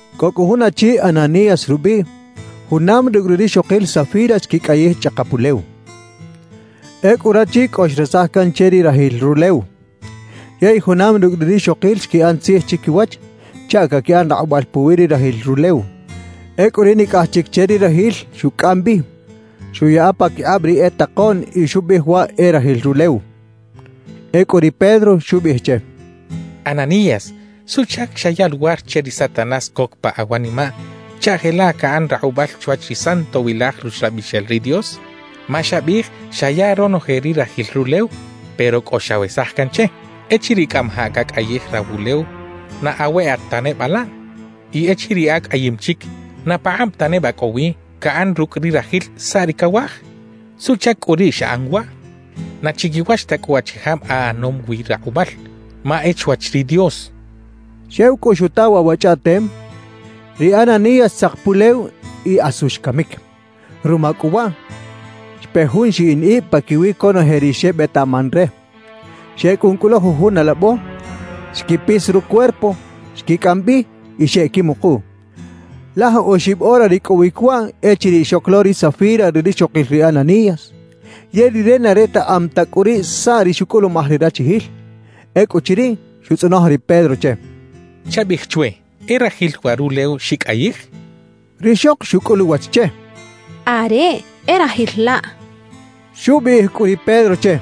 Cꞌo cꞌu jun achi Ananías rubiꞌ, junam rucꞌ ri rixokil Safira xquicꞌayij chꞌakap ulew. Ecꞌu rachi cꞌo xresaj can che ri rajil rulew, yey junam rucꞌ ri rixokil xquiꞌan tzij chiquiwach chaꞌ caquiꞌan rakꞌubal puwi ri rajil rulew. Ecꞌu ri nicꞌaj chic che ri rajil xucꞌam bi, xuꞌyaꞌa paquikꞌab ri e takoꞌn y xubiꞌij waꞌ e rajil rulew. Ecꞌu ri Pedro xubiꞌij che: —Ananías, ¿suꞌchac xaya luwar che ri Satanás coc pa awanimaꞌ chaꞌ jelaꞌ caꞌan rakꞌubal chwach ri Santowilaj Ruxlabixel ri Dios? Ma xabiꞌij xaya ronoje ri rajil rulew, pero cꞌo xawesaj can che. Echiriꞌ cꞌamajaꞌ cacꞌayij rawulew, ¿na aweꞌat ta neba laꞌ? Y echiriꞌ acꞌayim chic, ¿na pakꞌab ta neba cꞌo wi caꞌan rucꞌ ri rajil saꞌ ri cawaj? ¿Suꞌchac cꞌu riꞌ xaꞌan waꞌ? ¡Na chiquiwach ta cꞌu achijab aꞌanom wi rakꞌubal ma e chwach ri Dios! —xchaꞌ. Xew cꞌu xuta waꞌ wa chꞌaꞌtem, ri Ananías xtzak pulew y asu xcamic. Ruma cꞌu waꞌ, xpe jun xiꞌin ib paquiwi conoje ri xebetaꞌman re. Xecꞌun cꞌu lo jujun alabo, xquipis rucuerpo, xquicꞌam bi y xeꞌquimukuꞌ. Laj oxib ora ricꞌowic waꞌ echiriꞌ xoc lo ri Safira ri rixokil ri Ananías; yey rire na retaꞌam ta cꞌu riꞌ saꞌ ri xucꞌulumaj ri rachijil. Ecꞌuchiriꞌ, xutzꞌonoj ri Pedro che: —Chabiꞌij chwe: ¿E rajil waꞌ rulew xicꞌayij? —xcha che. Rixok xucꞌul uwach che: —Areꞌ, e rajil laꞌ —xchaꞌ. Xubiꞌij cꞌu ri Pedro che: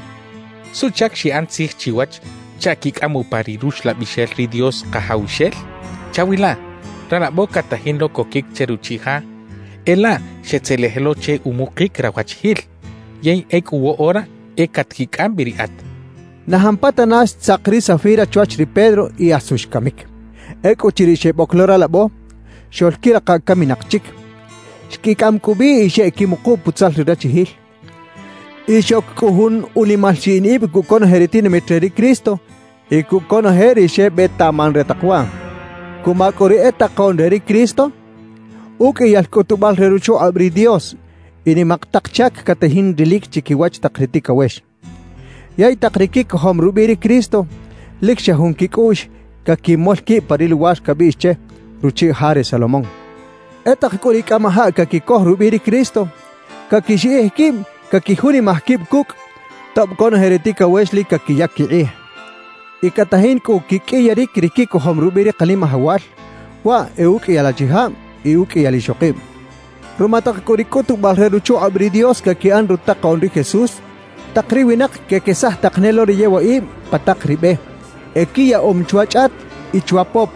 —¿Suꞌchac xiꞌan tzij chiwach chaꞌ quicꞌam upa ri Ruxlabixel ri Dios Kajawxel? ¡Chawilaꞌ! Ralabo catajin lo coquic che ruchiꞌ ja, e laꞌ xetzelej lo che umukic rawachijil, yey ecꞌu woꞌora e catquicꞌam bi riꞌat —xchaꞌ. Na jampatana xtzak ri Safira chwach ri Pedro y asu xcamic. Ecꞌuchiriꞌ xeboc lo ralabo, xoꞌlquirikaꞌ caminak chic. Xquicꞌam cꞌu bi y xeꞌquimuku putzal ri rachijil. Y xoc cꞌu jun unimal xiꞌin ib cucꞌ conoje ri tinamit re ri Cristo y cucꞌ conoje ri xebetaꞌman re tak waꞌ. Cuma cꞌu ri e takoꞌn re ri Cristo, uqꞌuiyal cꞌutubal re ruchukꞌab ri Dios y nimak tak chac catajin rilic chiquiwach tak ri ticawex. Yey tak ri quicojom rubiꞌ ri Cristo, lic xa jun quicꞌuꞌx caquimol quib pa ri luwar cabiꞌx che “Ruchiꞌ Ja re Salomón”. E tak cꞌu ri cꞌamajaꞌ caquicoj rubiꞌ ri Cristo, caquixiꞌij quib caquijunimaj quib cucꞌ, tob conoje ri ticawex lic caquiyac quikꞌij. Y catajin cꞌu quiqꞌuiyaric ri quicojom rubiꞌ ri Kanimajawal, waꞌ e uqꞌuiyal achijab y uqꞌuiyal ixokib. Ruma tak cꞌu ri cꞌutubal re ruchukꞌab ri Dios caquiꞌan rutakoꞌn ri Jesús, tak ri winak quequesaj tak ne lo ri e yewaꞌib pa tak ri be. Equiyaꞌom chwa chꞌat y chwa pop,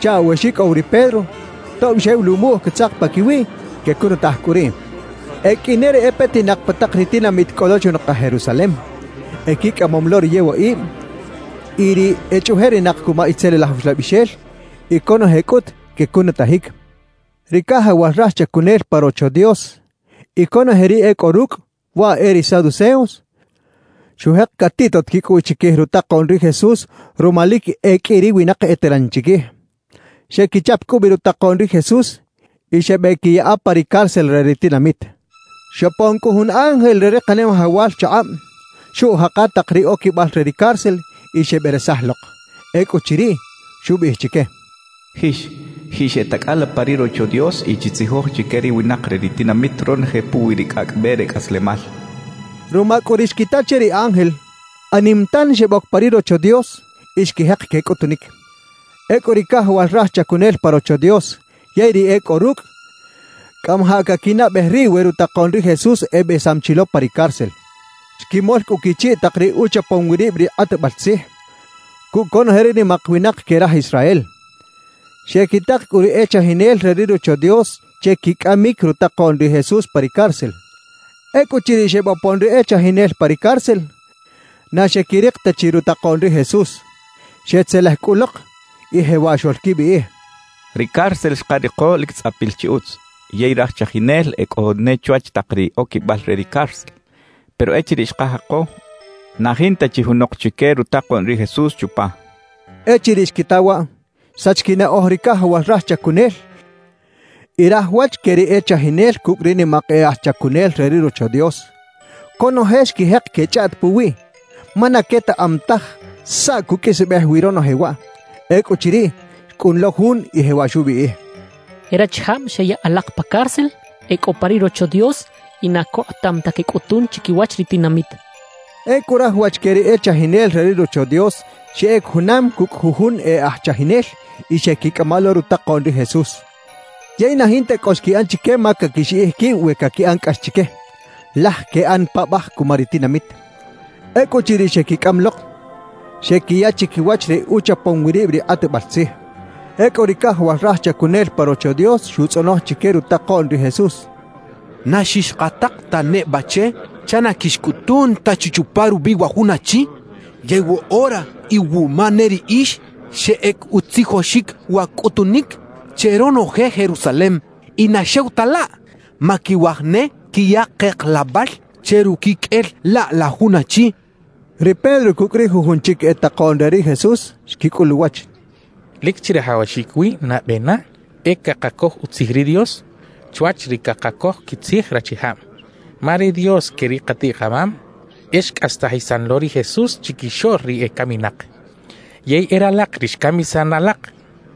chaꞌ we xicꞌow ri Pedro, tob xew luꞌmuꞌj catzak paquiwiꞌ, quecunutaj cꞌu riꞌ. E qꞌui ne ri e petinak pa tak ri tinamit cꞌo lo chunakaj Jerusalem. Equicꞌamom lo ri yewaꞌib y ri echꞌuꞌjerinak cuma itzelilaj uxlabixel; y conoje cꞌut quecunutajic. Ri cajawal raj chacunel pa Rocho Dios y conoje ri e cꞌo rucꞌ, waꞌ e ri saduceos, xujek catiꞌtot quicꞌuꞌx chiquij rutakoꞌn ri Jesús ruma lic e qꞌui ri winak eteran chiquij. Xequichap cꞌu bi rutakoꞌn ri Jesús y xebeꞌquiyaꞌa pa ri cárcel re ri tinamit. Xopon cꞌu jun ángel re ri Kanimajawal chakꞌab, xuꞌjaka tak ri oquibal re ri cárcel y xeberesaj lok. Ecꞌuchiriꞌ, xubiꞌij chique: «Jix, jixeꞌtacꞌala pa ri Rocho Dios y chitzijoj chique ri winak re ri tinamit ronoje puwi ri cꞌacꞌ be re cꞌaslemal» xchaꞌ. Ruma cꞌu ri xquita che ri ángel, anim tan xeboc pa ri Rocho Dios y xquijek quecꞌutunic. Ecꞌu ri cajawal raj chacunel pa Rocho Dios yey ri e cꞌo rucꞌ, cꞌamajaꞌ caquinaꞌbej riꞌ we rutakoꞌn ri Jesús ebesam chi lo pa ri cárcel. Xquimol cꞌu quichiꞌ tak ri uchapom wi rib ri kꞌatbal tzij, cucꞌ conoje ri nimak winak que raj Israel. Xequitak cꞌu ri e chajinel re ri Rocho Dios che quicꞌamic rutakoꞌn ri Jesús pa ri cárcel. Ecꞌuchiriꞌ xebopon ri e chajinel pa ri cárcel, na xequirik ta chi rutakoꞌn ri Jesús. Xetzelej cꞌu lok y jewaꞌ xoꞌlquibiꞌij: «Ri cárcel xkariko lic tzꞌapil chi utz, yey raj chajinel e cꞌo ne chwach tak ri oquibal re ri cárcel. Pero echiriꞌ xkajako, na jinta chi junok chique rutakoꞌn ri Jesús chupa» xechaꞌ. Echiriꞌ xquita waꞌ, xsach quinaꞌoj ri cajawal raj chacunel y raj wach que ri e chajinel cucꞌ ri nimak e aj chacunel re ri Rocho Dios. Conoje xquijek quechꞌaꞌt puwiꞌ, ma na quetaꞌam taj saꞌ cuqꞌuisbej wi ronoje waꞌ. Ecꞌuchiriꞌ, xcꞌun lo jun y jewaꞌ xubiꞌij: «E rachijab xeyaꞌ alak pa cárcel, e cꞌo pa ri Rocho Dios y na cokꞌotam ta quecꞌutun chiquiwach ri tinamit» xchaꞌ. Ecꞌu raj wach que ri e chajinel re ri Rocho Dios xeꞌec junam cucꞌ jujun e aj chajinel y xeꞌquicꞌama lo rutakoꞌn ri Jesús. Yey na jinta cꞌo xquiꞌan chique ma caquixiꞌij quib we caquiꞌan cꞌax chique, laj queꞌan paꞌbaj cuma ri tinamit. Ecꞌuchiriꞌ xequicꞌam lok, xequiya chiquiwach ri uchapom wi rib ri kꞌatbal tzij. Ecꞌu ri cajawal raj chacunel pa Rocho Dios xutzꞌonoj chique rutakoꞌn ri Jesús: —¿Na xixkatak ta neba che chaꞌ na quixcꞌutun ta chi chupa rubiꞌ wa jun achi? Yey woꞌora iwuma ne riꞌix xeꞌec utzijoxic wa cꞌutunic che ronoje Jerusalem; y na xew ta laꞌ, ma quiwaj ne quiya keklabal che ruquiqꞌuel laꞌ la jun achi —xechaꞌ. Ri Pedro cucꞌ ri jujun chic e takoꞌn re ri Jesús xquicꞌul uwach: —Lic chirajawaxic wi nabe na e cakacoj utzij ri Dios chwach ri cakacoj quitzij rachijab. Ma ri Dios que ri katiꞌ-kamam e xcꞌastajisan lo ri Jesús chiquixoꞌl ri ecaminak. Yey e ralak ri xcamisan alak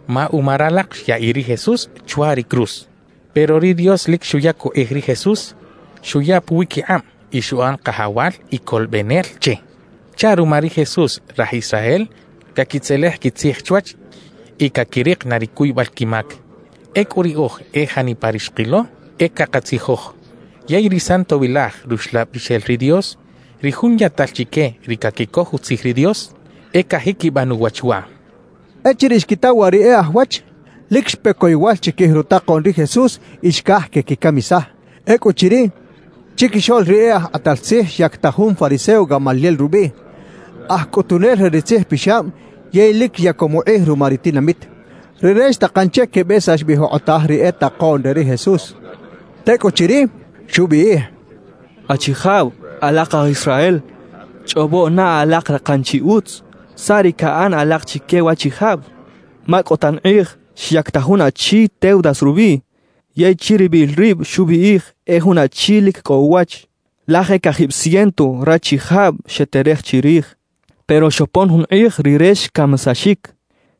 ma uma ralak xyaꞌiꞌ ri Jesús chwa ri cruz. Pero ri Dios lic xuyac ukꞌij ri Jesús, xuya puwiquikꞌab y xuꞌan Kajawal y Colobenel che; chaꞌ ruma ri Jesús, raj Israel caquitzelej quitzij chwach y caquirik na ri cuybal quimac. »Ecꞌu riꞌoj, e janipa ri xkilo, e cakatzijoj. Yey ri Santowilaj Ruxlabixel ri Dios, ri Jun yaꞌtal chique ri caquicoj utzij ri Dios, e cajiquiban uwach waꞌ —xechaꞌ. Echiriꞌ xquita waꞌ ri e aj wach, lic xpe coyowal chiquij rutakoꞌn ri Jesús y xcaj quequicamisaj. Ecꞌuchiriꞌ, chiquixoꞌl ri e aj kꞌatal tzij xyactaj jun fariseo Gamaliel rubiꞌ, aj cꞌutunel re ri tzijpixab yey lic yacom ukꞌij ruma ri tinamit. Rire xtakan che quebesax bi jokꞌotaj ri e takoꞌn re ri Jesús. Tecꞌuchiriꞌ, xubiꞌij: «Achijab, alak aj Israel, chꞌobo na alak rakan chi utz saꞌ ri caꞌan alak chique waꞌchijab. Ma cꞌo tan kꞌij xyactaj jun achi Teudas rubiꞌ, yey chiribil rib xubiꞌij e jun achi lic cꞌo uwach. Laj e cajib ciento rachijab xeterej chirij. Pero xopon jun kꞌij rire xcamisaxic.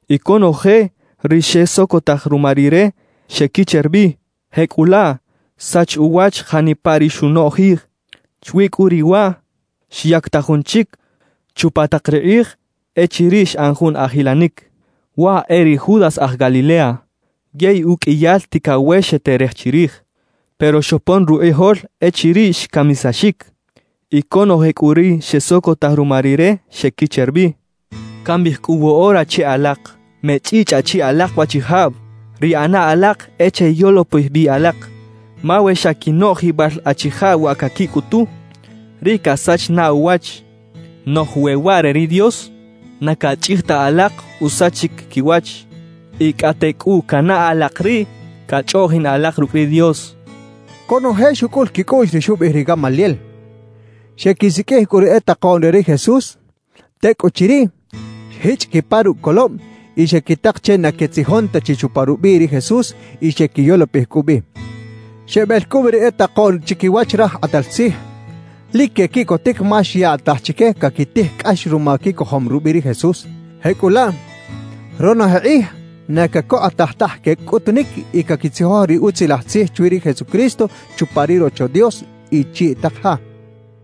Y conoje ri xesocotaj ruma rire, xequicher bi; jecꞌulaꞌ, xsach uwach janipa ri xunoꞌjij. »Chwi cꞌu riꞌ waꞌ, xyactaj jun chic chupa tak ri kꞌij echiriꞌ xꞌan jun ajilanic. Waꞌ e ri Judas aj Galilea. Yey uqꞌuiyal ticawex xeterej chirij. Pero xopon rukꞌijol echiriꞌ xcamisaxic; y conoje cꞌu ri xesocotaj ruma rire, xequicher bi. »Cambiꞌij cꞌu woꞌora che alak: Mechꞌichꞌaꞌ chi alak waꞌchijab; ri ꞌana alak e cheyolopij bi alak. Ma we xa quinoꞌjibal achijab wa caquicꞌutu, riꞌ casach na uwach. Noꞌj we waꞌ re ri Dios, na cachꞌij ta alak usachic quiwach; y cꞌate cꞌu canaꞌ alak riꞌ cachꞌoꞌjin alak rucꞌ ri Dios» xchaꞌ. Conoje xucꞌul quicꞌuꞌx ri xubiꞌij ri Gamaliel. Xequisiqꞌuij cꞌu ri e takoꞌn re ri Jesús; tecꞌuchiriꞌ, xjichꞌ quipa rucꞌ colob y xequitak che na quetzijon ta chi chupa rubiꞌ ri Jesús y xequiyolopij cꞌu bi. Xebel cꞌu bi ri e takoꞌn chiquiwach raj kꞌatal tzij. Lic quequiꞌcotic ma xyaꞌtaj chique caquitij cꞌax ruma quicojom rubiꞌ ri Jesús. Jecꞌulaꞌ, ronoje kꞌij na cacokꞌotaj taj quecꞌutunic y caquitzijoj ri Utzilaj Tzij chwi ri Jesucristo chupa ri Rocho Dios y chiꞌ tak ja.